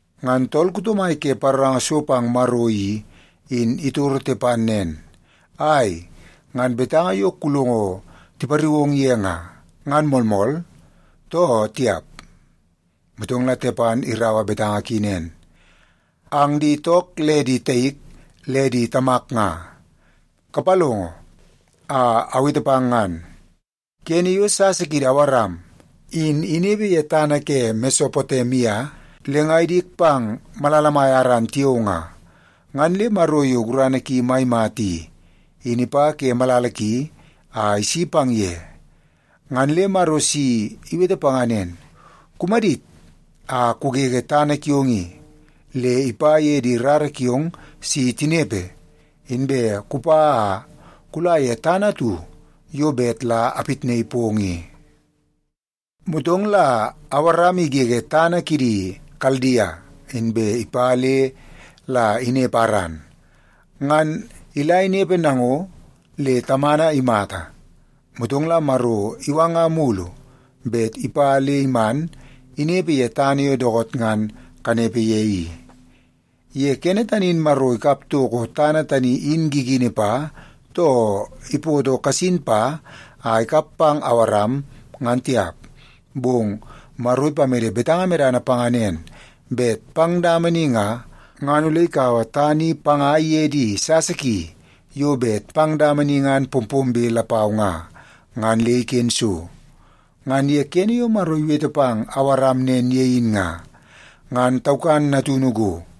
Ngan tool kuto mai ke paroranga so pang Maro i, in itoro Tepan nen, “Ai, ngan betanga yo kulongo tipariu ong ye nga, ngan moolmool, too tiap?” Motong la Tepan iraua betanga ki nen, “Ang di took le di taik le di tamak nga, kapalongo a awete pang ngan. Kene yo sasa kiidi Awaram in inepe ye tana ke Mesopotemia le nga idik pang malala mai Aran tiao nga, ngan le Maro yo gurana ki mai mata i, in ipa ke malala ki a isi pang ye. Ngan le Maro si iwete panga nen, ‘Kumadit a kugege tana kiong i le ipa ye di rara kiong si tinepe, inbe kupa a kula ye tana atu yo bet la apitnaii pong i.’ “Motong la Awaram igege tana kidi Kaldia, inbe ipa le la inepe Aran. Ngan ila inepe nango le tamana imata, motong la Maro iwanga mulu bet ipa le iman inepe ye tana yo dookoot ngan kanepe ye i. Ye kene tani in Maro ikap toko tana tani i gigini pa, too ipoto kasin pa a ikap pang Awaram, ngan tiap. Bong Maro ipamede betanga medana panga nen, bet pang dama ni nga, ngan ole ikaua tana i panga iye di sasa ki yo bet pang dama ni ngan pompombe lapau nga, ngan le iken so. Ngan ye kene yo Maro iwete pang Awaram nen ye in nga, ngan taukan natunu go.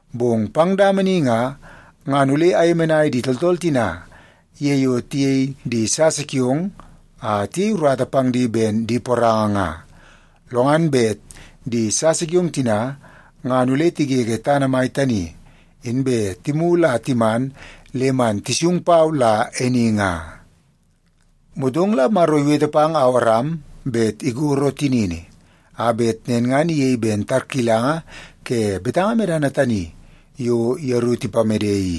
Bong pang dama ni nga, ngan ole ayemenai di tooltool tina ye yo tiyei di sasa kiong a tiyei urata pang di ben di poranga nga. Lo ngan bet di sasa kiong tina ngan ole tigege tana mai tani, inbe timulu a timan le man tisung pau la e ni nga.’ Motong la Maro iwete pang Awaram bet ikoro tinini, a bet nen ngan iyei ben tarkilanga ke betanga medana tani yo yeru tipamede i.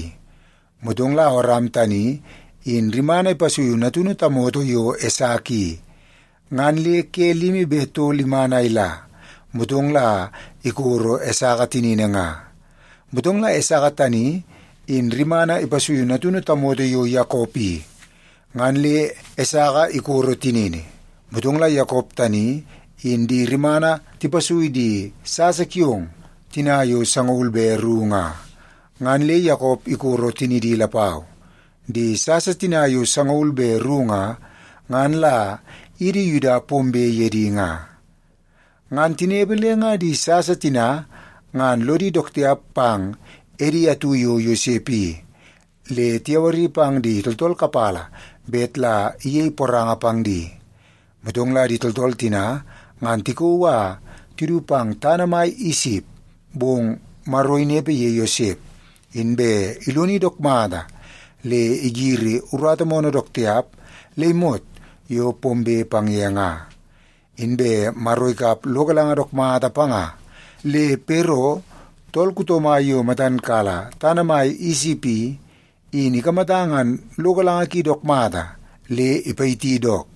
Motong la Awaram tani in rimana ipasuiu natunu tamoto yo Esaka i, ngan le ke limi be tol iman a ila, motong la ikoro Esaka tinini nga. Motong la Esaka tani in rimana ipasuiu natunu tamoto yo Yakop i, ngan le Esaka ikoro tinini. Motong la Yakop tani in di rimana tipasui di sasa kiong tina yo sangaul be ru nga, ngan le Yakop ikoro tinidi lapau. Di sasa tina yo sangaul be ru nga, ngan la idi Yuda pombe ye di nga. “Ngan tinepe le nga di sasa tina ngan lodi dook tiap pang edi atu yo Yosep i, le tiyawari pang di tooltool kapala bet la iyei poranga pang di. Motong la di tooltool tina ngan tikauu a tidu pang tana mai Isip, bong Maro inepe ye Yosep, inbe iloni dook mata le igiri urata moonoo dook tiap le imot yo pombe pang ye nga. Inbe Maro ikap lo galanga dook mata panga, le Pero, tool kuto mai yo matan kala tana mai Isip i, in ikamata ngan lo galanga ki dook mata le ipayiti dook.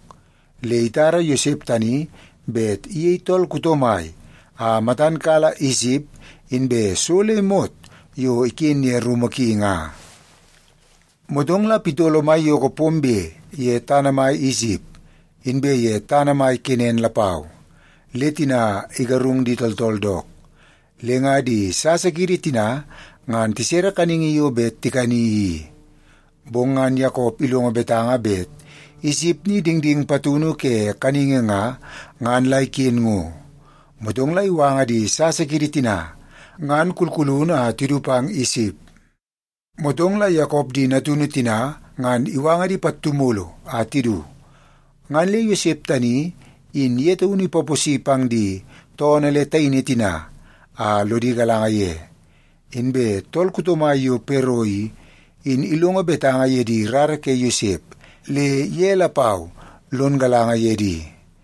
Le itara Yosep tani bet iyei tool kuto mai a matan kala Isip inbe so le imot yo iken ye rumu ki nga. “Motong la pitolo maiyoko pombe ye tana mai Isip, inbe ye tana mai Kenan lapau, le tina igarung di tooltool dook. Le nga di sasa kiidi tina ngan tisere kaningi yo bet tikani i. Bong ngan Yakop ilongo betanga bet Isip ni dingding patunu ke kaningi nga, ngan la iken ngo. Motong la iwanga di sasa kiidi tina ngan kulkulunu a tidu pang Isip. Motong la Yakop di natunu tina ngan iwanga di pattu mulu a tidu, ngan le Yosep tani in ye taunu ipaposi pang di toonoo le taini tina a lodi galanga ye. Inbe tool kuto mai yo Pero i, in ilongo betanga ye di rara ke Yosep, le ye lapau lon galanga ye di.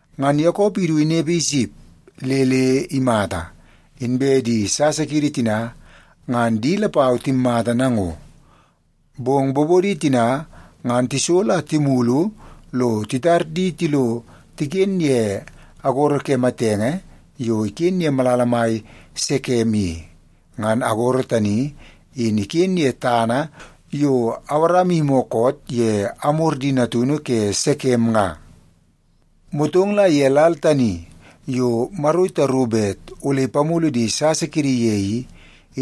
Ngan Yakop idu inepe Isip le le imata, inbe di sasa kiidi tina, ngan di lapau timmata nango. Bong bobodi tina ngan tisolo a timulu lo titar di tilo tiken ye agoro ke matenge yo iken ye malala mai Sekem i. Ngan agoro tani, in iken ye tana yo Awaram iyimi koot ye Amor di natunu ke Sekem nga. “Motong la ye lal tani yo Maro itaru bet ole ipamulu di sasa kiidi ye i,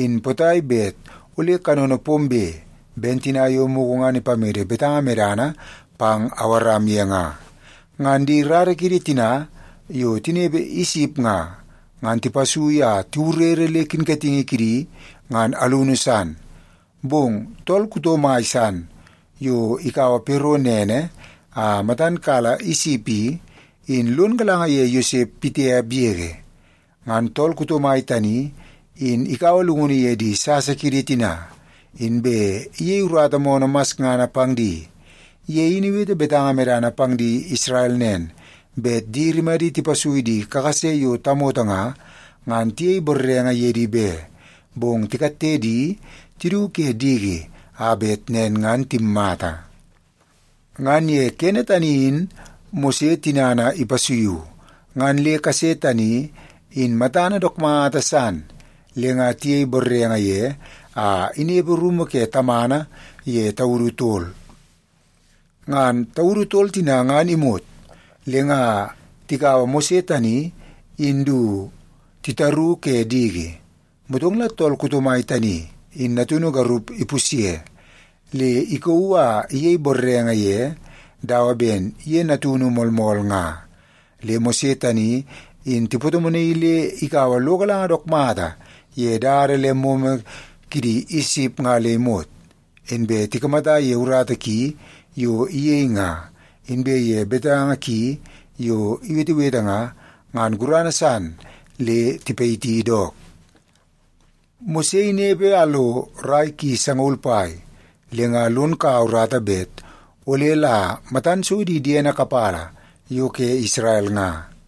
in potai bet ole kanono pombe ben tina yo mugu ngan ipamede betanga medana pang Awaram ye nga, ngan di rara kiidi tina yo tinepe Isip nga, ngan tipasui a tiwurere le kinkatingi kidi ngan alunu san. Bong tool kuto mai san yo ikaua Pero nene a matan kala Isip i, in lon galanga ye Yosep pitiap yege. Ngan tool kuto mai tani in ikaua llungunu ye di sasa kiidi tina, inbe iyei urata moonoo masngana pang di. Ye in iwete betanga medana pang di Isrel nen, bet di rimadi tipasui di kakase yo tamoto nga, ngan tiyei borrenge ye di be, bong tikatte di tidu ke diki a bet nen ngan timmata. “Ngan ye kene tani in Mose tinana ipasuiu, ngan le kase tani in matana dook mata san, le nga tiyei borrenge ye a inepe rumu ke tamana ye taudu tol. Ngan taudu tol tina ngan imot, le nga tikaua Mose tani in du titaru ke diki. Motong la tool kuto mai tani in natunu garup ipusye, le ikauu a iyei borrenge ye dawa ben ye taunu natunu moolmool nga. Le Mose tani in tipatomonaii le ikaua lo galanga dook mata ye dada le momo kidi Isip nga le imot. Inbe tikamata ye urata ki yo iyei nga, inbe ye betanga ki yo iwetewete nga, ngan gurana san le tipayiti dook. “Mose inepe a lo rai ki sangaul pai, le nga lon kaua urata bet ole la matan so di diene kapala yo ke Isrel nga.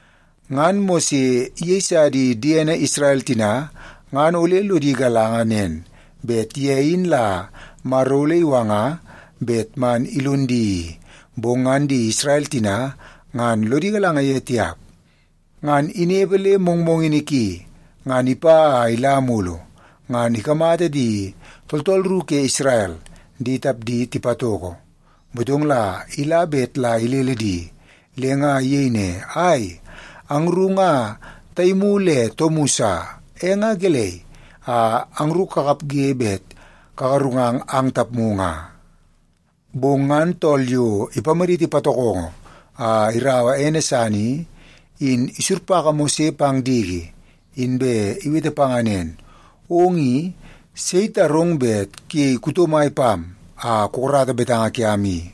Ngan Mose iyeisa di diene Isrel tina ngan ole lodi galanga nen, bet ye in la Maro ole iwanga bet man ilon di i, bong ngan di Isrel tina ngan lodi galanga ye tiap. Ngan inepe le mongmongini ki, ngan ipa a ila mulu, ngan ikamata di tooltool ru ke Isrel di tapdi tipatoko. Motong la ila bet la ilele di, le nga iyei ne, ‘Ai, angru nga taimu le toomu sa, e nga gelei a angru kakapge bet kagarungang ang tapmu nga?’ “Bong ngan tool yo ipamaditi patokongo a iraua ene san i, in isurpaka Mose pang diki, inbe iwete panga nen, ‘Ong i, sei itarong bet kuyei kuto mai pam a kukarata betanga kiam i?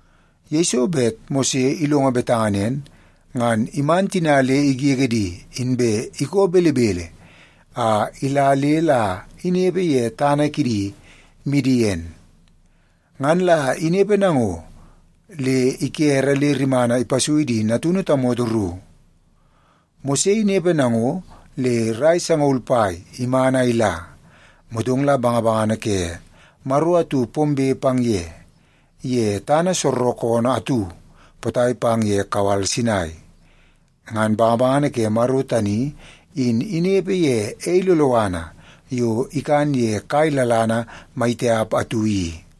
Yeiso bet Mose ilongo betanga nen, ngan iman tina le igege di, inbe ikoo belebele a ila le la inepe ye tana kidi Midien. Ngan la inepe nango le ikere le rimana ipasui di natunu tamoto ru. “Mose inepe nango le rai sangaul pai iman a ila. Motong la bangabangana ke Maro atu pombe pang ye, ye tana soorookoonoo atu potai pang ye kawal Sinai. Ngan bangabangana ke Maro tani in inepe ye ei loloana yo ikan ye kai lalana mai tiap atu i.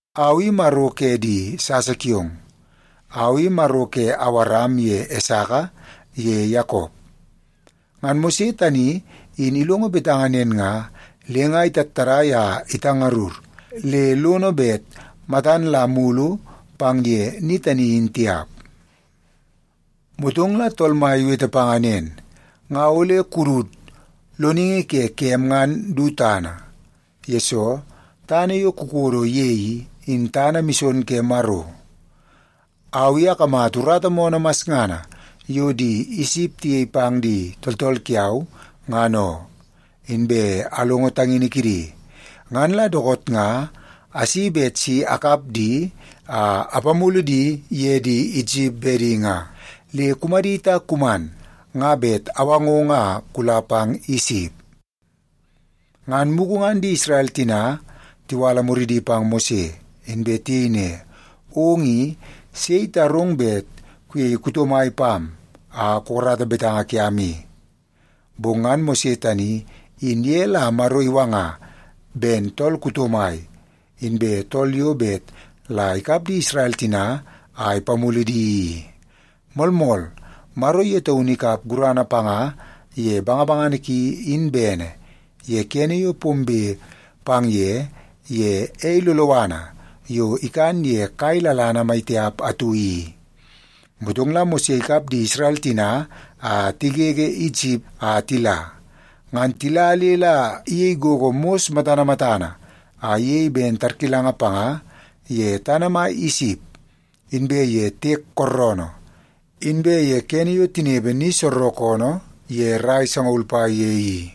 ‘Au i Maro ke di sasa kiong. Au i Maro ke Awaram ye Esaka ye Yakop.’ Ngan Mose tani in ilongo betanga nen nga, le nga itattadai a itangarur le lono bet matan la mulu pang ye ni tani in tiap. “Motong la Tool Mai iwete panga nen, ‘Nga ole kudut loningi ke kem ngan du tana, yesoo tana yo kukodo ye i, in tana mison ke Maro. Au i akamata urata moonoo masngana yo di Isip tiyei pang di tooltool kiau, ngan oo. Inbe alongo tangini kidi, ngan la dookoot nga asi bet si akap di a apamulu di ye di Isip bedi nga. Le kumadit a kuman, nga bet awangong a kula pang Isip.’ “Ngan mugu ngan di Isrel tina tiwala muridi pang Mose, inbe tiyei ne, ‘Ong i, sei itarong bet kuyei kuto mai pam a kukarata betanga kiam i?’ Bong ngan Mose tani, in ye la Maro iwanga ben tool kuto mai, inbe tool yo bet la ikap di Isrel tina a ipamulu di i. Moolmool, Maro ye taunu ikap gurana panga ye bangabangana ki in bene, ye kene yo pombe pang ye, ye ei loloana yo ikan ye kai lalana mai tiap atu i. Motong la Mose ikap di Isrel tina a tigege Isip a tila. Ngan tila le la iyei gogo mos matana matana a iyei ben tarkilanga panga ye tana mai Isip, inbe ye Tiek Kooroonoo, inbe ye kene yo tinepe ni soorookoonoo ye rai sangaul pai ye i.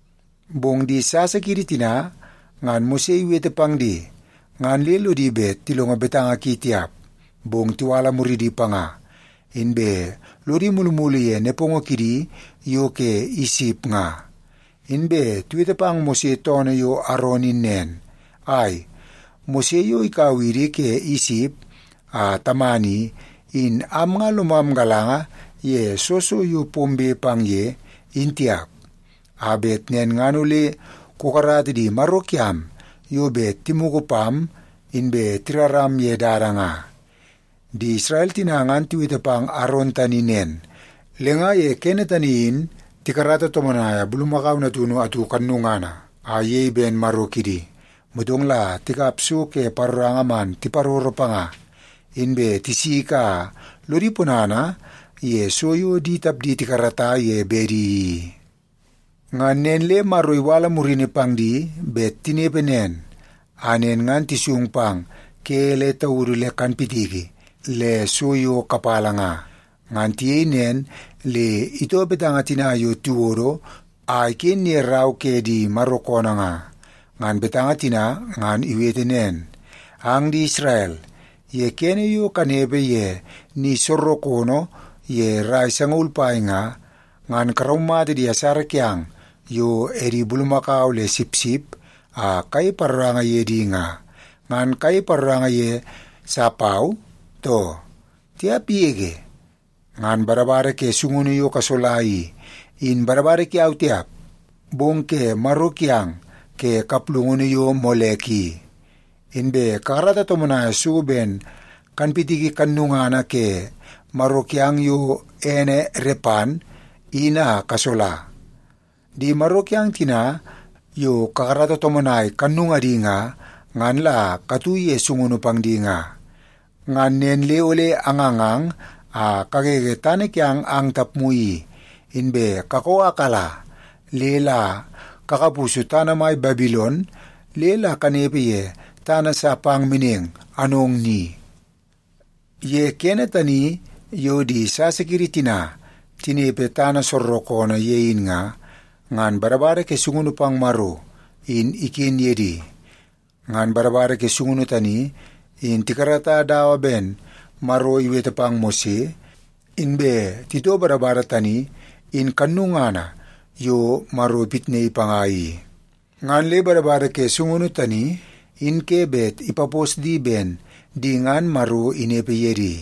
“Bong di sasa kiidi tina ngan Mose iwete pang di, ngan le lodi bet tilongo betanga ki tiap, bong tiwala muridi panga, inbe lodi mulumulu ye nepongo kidi yo ke Isip nga. Inbe tiwete pang Mose toonoo yo Aron in nen, ‘Ai, Mose yo ikau idi ke Isip a taman i, in am nga lomam galanga ye soo so yo pombe pang ye, in tiap. A bet nen ngan ole kukarata di maro kiam yo bet timugu pam inbe tiraram ye dada nga.’ Di Isrel tina ngan tiwete pang Aron tani nen, le nga ye kene tani in tikarata tomonaia bulumakau natunu atu kannungana a iyei ben maro kidi, motong la tikap so ke paroranga man tiparoro panga, inbe tisiki a lodi ponana ye so yo di tapdi tikarata ye bedi i. “Ngan nen le Maro iwala murini pang di bet tinepe nen, a nen ngan tisung pang ke le taudu le kanpitiki le so yo kapala nga. Ngan tiyei nen le itoo betanga tina yo tiwodo a iken ye rau ke di Maro koonoo nga. Ngan betanga tina ngan iwete nen, ‘Ang di Isrel, ye kene yo kanepe ye ni soorookoonoo ye rai sangaul pai nga, ngan karaumata di asara kiang yo edi bulumakau le sipsip a kayei paroranga ye di nga, ngan kayei paroranga ye sa pau, too? Tiap yege! Ngan badabada ke sungunu yo kasola i, in badabada kiau tiap, bong ke maro kiang ke kaplungunu yo Molek i. Inbe kakarata tomonai so ben kanpitiki kannungana ke maro kiang yo ene Repan, in a kasola. Di maro kiang tina yo kakarata tomonai kannungadi nga, ngan la katu ye sungunu pang di nga. Ngan nen le ole angangang a kagege tana kiang ang tapmu i, inbe kakoo a kala le la kakapusu tana mai Babilon le la kanepe ye tana sa pang meneng anong ni.’ “Ye kene tani yo di sasa kiidi tina tinepe tana soorookoonoo ye in nga, ngan badabada ke sungunu pang Maro in iken ye di. Ngan badabada ke sungunu tani, in tikarata dawa ben Maro iwete pang Mose, inbe itoo badabada tani in kannungana yo Maro ipitnaii panga i. Ngan le badabada ke sungunu tani, in ke bet ipapos di ben di ngan Maro inepe ye di.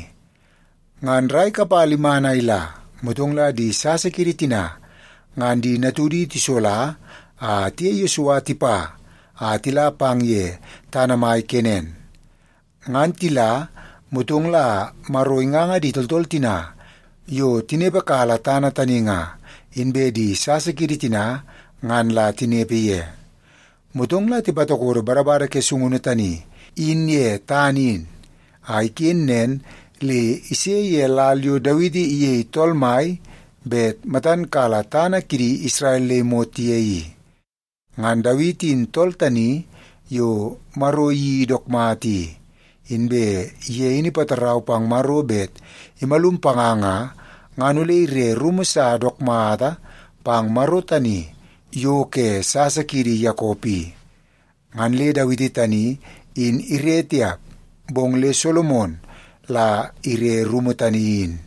Ngan rai kapala iman a ila, motong la di sasa kiidi tina ngan di natudi tisola a tiye Yesua tipa a tila pang ye tana mai Kenan. Ngan tila, motong la Maro inganga di tooltool tina yo tinepe kala tana tani nga, inbe di sasa kiidi tina ngan la tinepe ye. Motong la tipatokodo badabada ke sungunu tani in ye tana in, a iken nen le ise ye lal yo Dawiti iyei tool mai bet matan kala tana kidi Isrel le imot ye i. Ngan Dawiti in tool tani yo Maro iyeii dook mata i. Inbe ye in ipatarau pang Maro bet imalum panga nga, ngan ole ire rumu sa dook mata pang Maro tani yo ke sasa kiidi Yakop i. Ngan le Dawiti tani in ire tiap, bong le Solomon la ire rumu tani in.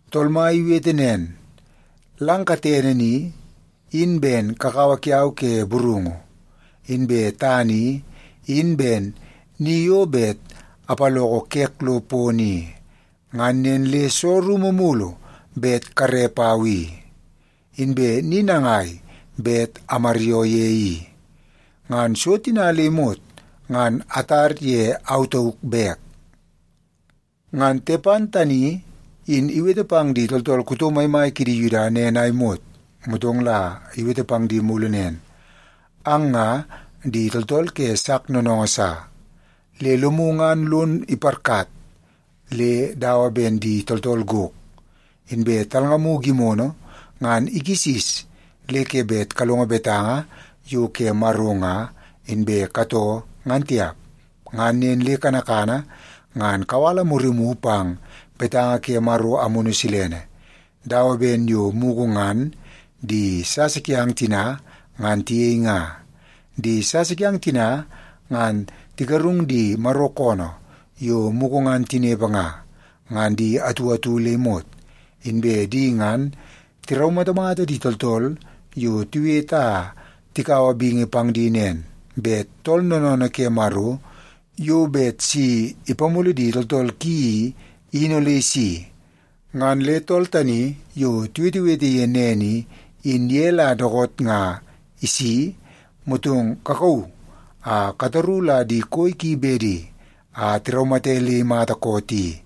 ‘Tool Mai iwete nen, “Lang katene ni, in ben kakawa kiau ke burungu, inbe tana i, in ben ni yo bet apaloko kek lo pono i. Ngan nen le soo rumu mulu bet kare pau i? Inbe ni nangai bet amaryoo ye i? Ngan so tina nga le imot, ngan atar ye au tauk bek.”’” Ngan Tepan tani in iwete pang di tooltool kuto maimai kidi Yuda nen a imot, motong la iwete pang di mulu nen, “Ang nga di tooltool ke sak noonoongoo sa. Le lomu ngan lon iparkat le dawa ben di tooltool gok, inbe talngamu gimono ngan ikisis le ke bet kalongo betanga yo ke Maro nga, inbe katoo ngan tiap. Ngan nen le kanakana ngan kawala murimu pang betanga ke Maro Amunu Silene, dawa ben yo mugu ngan di sasa kiang tina, ngan tiyei nga. Di sasa kiang tina ngan tigarung di Maro koonoo yo mugu ngan tinepe nga, ngan di atu atu le imot. Inbe di ngan tiraumatamata di tooltool yo tiwete a tikaua bingi pang di nen, bet Tool Noonoonoo ke Maro yo bet si ipamulu di tooltool ki i, in ole isi. Ngan le tool tani yo tiwetewete ye nen i, in ye la dookoot nga isi, motong kakauu a kataru la di koi ki bedi, a tiraumate le imata koot i.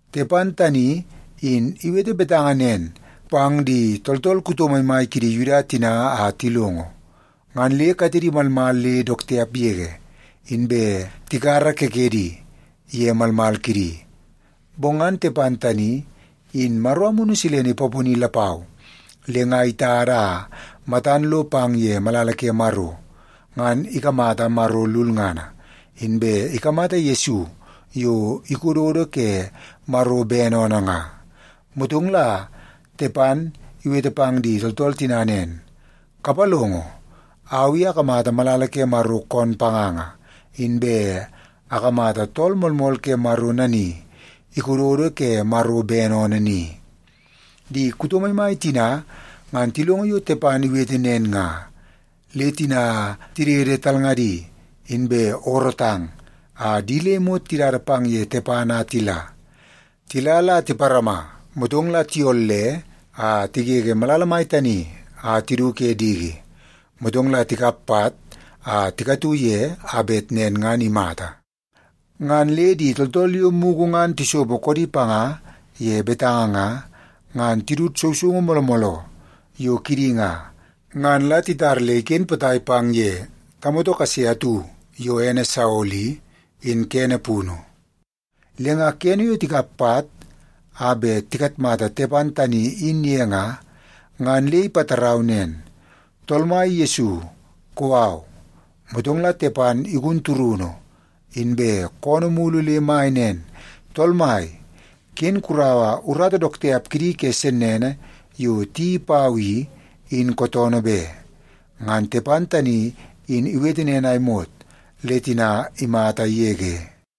Tepan tani in iwete betanga nen pang di tooltool kuto maimai kidi Yuda tina a tilongo, ngan le katedi malmal le dook tiap yege, inbe tikara kekedi ye malmal kidi. Bong ngan Tepan tani, in Maro Amunu Silene ipaponi lapau, le nga itada a matan lo pang ye malala ke Maro, ngan ikamata Maro lulngana, inbe ikamata Yesu yo ikododo ke Maro bene oonoo nga. Motong la Tepan iwete pang di tooltool tina nen, “Kapalongo! Au i akamata malala ke Maro koon panganga, inbe akamata Tool Moolmool Ke Maro nani ikododo ke Maro bene oonoo ni.” Di kuto maimai tina ngan tilongo yo Tepan iwete nen nga, le tina tidede talngadi, inbe oorootang, a di le imot tidada pang ye Tepan a tila. Tila la tiparama, motong la tiyolle a tigege malala mai tani a tidu ke diki, motong tikap pat a tikatu ye a bet nen ngan imata. Ngan le di tooltool yo mugu ngan tisopo koodi panga ye betanga nga, ngan tidut sousoungu mooloo mooloo yo kidi nga, ngan la titar le iken potai pang ye tamoto kase atu yo ene Saolo i, in kene punu. Le nga kene yo tikap pat a bet tikatmata Tepan tani in ye nga, ngan le ipatarau nen, “Tool Mai Yesu, kou au.” Motong la Tepan igun turunu, inbe koonoo mulu le mai nen, “Tool Mai, ken kuraua urata dook tiap kidi ke sennene yo tiyeii pau i, in kootoonoo be.” Ngan Tepan tani in iwete nen a imot, le tina imata yege.